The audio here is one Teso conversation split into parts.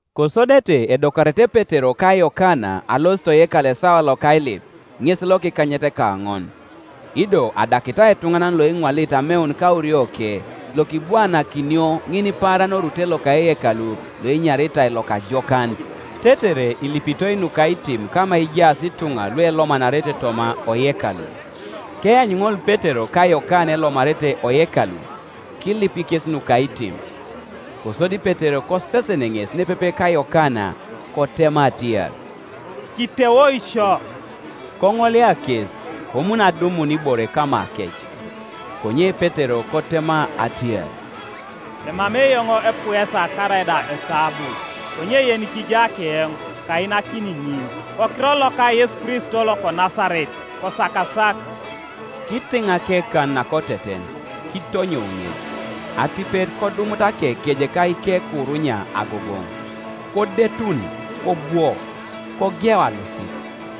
Kosodete edokarete Petero ka Yokana alosit oyekalu esawa loka ailip, ŋes lokikanyetekaoŋon. Ido adakitai etuŋanan Ioeŋwalit ameun kaurioke, lokibwaanakinio ŋinipaaran orute loka eyakalu loenyaritai Lokajokan, tetere ilipitoi nukaitim kama ejaas ituŋa luelomanarete toma oyekalu, Keanyu ŋol Petero ka Yokana elomarete oyekalu, kilip kes nukaitim. Kosodi Petero kosesen ŋes nepepe ka Yokana, kotema atiar, “Kiteoi sio.” Koŋolia kes, komun adumun ibore kamakec. Konye Petero kotema atiar, “Emamei eoŋ epuesa karaida esabu; konye yenikija keoŋ, kainakini ŋin, Kokiror loka Yesu Kristo loko Nasaret, kosakasak.” Kitiŋ akekan nakoteten, kitonyou ŋes: atipet kodomut akekeje ka ikekurunya agogoŋ. Kodetu, kobwo, kogeu alosit;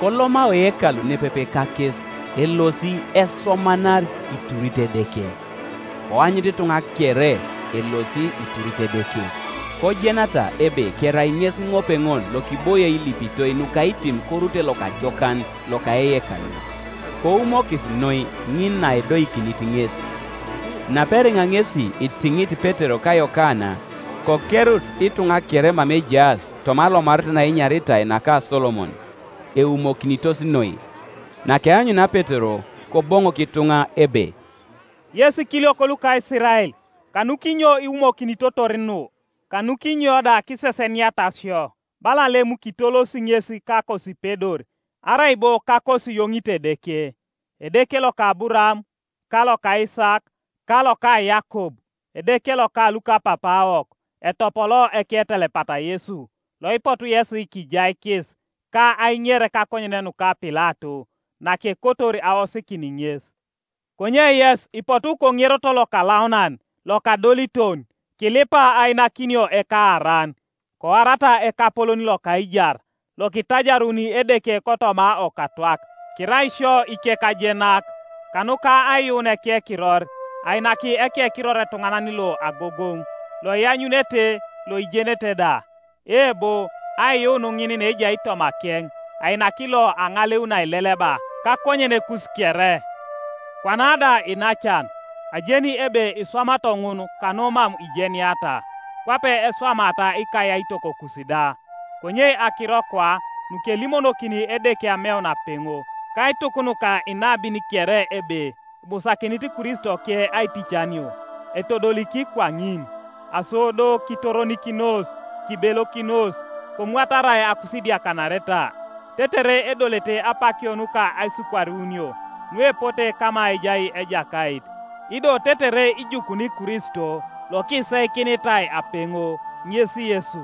koloma oyekalu nepepe kakes, elosi, esomanari, iturit Edeke, Koanyut ituŋa kere elosi iturit Edeke. Kojenata ebe kerai ŋesi ŋopeŋol lokiboie ilipitoi nukaitim korute Lokajokan loka eyekalu: koumokis noi ŋin naedoikinit ŋes. Naperiŋa ŋesi itiŋit Petero ka Yokana, kokerut ituŋa kere mama ejaas toma alomaret naenyaritai naka Solomon, eumokinitos noi. Nakeanyunia Petero, Koboŋok ituŋa ebe, “Yes ikiliok luka Isirael, kanukinyo iwumokinitotor nu, kanukinyo da kiseseniata sio, bala Iem kitolosi ŋes kakosipedor arai bo kakosiyoŋit Edeke? Edeke loka Aburaam, ka loka Isaak, ka loka Yakob, Edeke loka lukapapaawok etopoloo Eketelepat Yesu; loipotu yesi kijaikis, ka aiŋer kakonyen nuka Pilato, nakekotor aosikin ŋes. Konye yes ipotu koŋeroto Lokalaunan Lokadoliton, kilipa ainakinio ekaaran, koarata Ekapolon loka aijar; lokitajaruni Edeke kotoma okatwak, Kirai isio ikekajenak. Kanuka aiyuun ekekiror ainak ekekiror etuŋanan lo agogoŋ, loianyunete loijenete da; eebo, aiyuun ŋin naejai mamakeŋ ainak lo aŋaleu naeleleba kakonyenekus kere. “Kwana da iinacan, ajeni ebe iswamato ŋun kanu mam ijeniata, kwape eswamaata ikayaitokokus da. Konye akiro kwa nukelimonokini Edeke ameun apeŋo kaituk nuka inabin kere ebe ibusakinit Kristoke aiticanio, etodoliki kwaŋin. Aso do kitoronikinos, kibelokinos, komwatarai akusidiakanareta, tetere edolete apakio nuka aisikwarunio nuepote kama ejai Ejakait, Ido tetere ijukuni Kristo lokiseikinitai apeŋo, ŋes Yesu: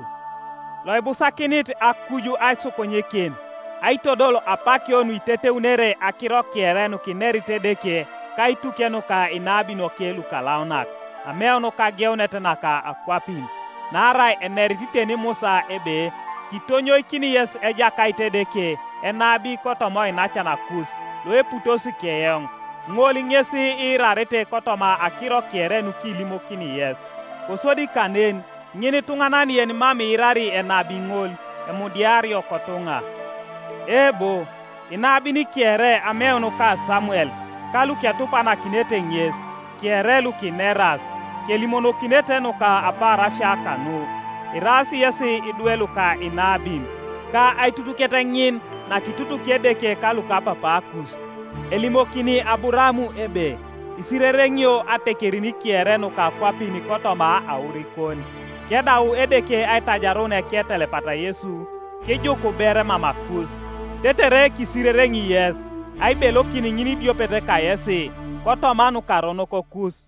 loibusakinit akuj aisukunyikin aitodol apakio nuiteteunere akiro kere nukinerit Edeke kaituke nuka inabinoke lukalaunak ameun kageunet naka akwapin. Naarai enerit teni Musa ebe, ‘Kitonyoikini yes Ejakait Edeke enabi kotoma oinacanakus loeputos keoŋ. Ŋol ŋes iirarete kotoma akiro kere nukilimokini yes. Kosodi kanen, ŋinituŋanan yenimam iirari enabi ŋol emudiario kotuŋa.’ Eebo, inabin kere ameun ka Samuel ka luketupakinete ŋes, kere lukineras, kelimonokinete nuka apaarasia kanu. Iraas yesi idwe luka inabin ka aitutuket ŋin nakitutuki Edeke kalukapapaakus, elimokini Aburaam ebe, ‘Isirereŋio atekerin kere nuka akwapin kotoma aurikon.’ Kedau Edeke aitajarun eketelepat Yesu, kijuku ber mamakus, tetere kisirereŋi yes aibelokin ŋinidiopet kayesi kotoma nukaronokokus.”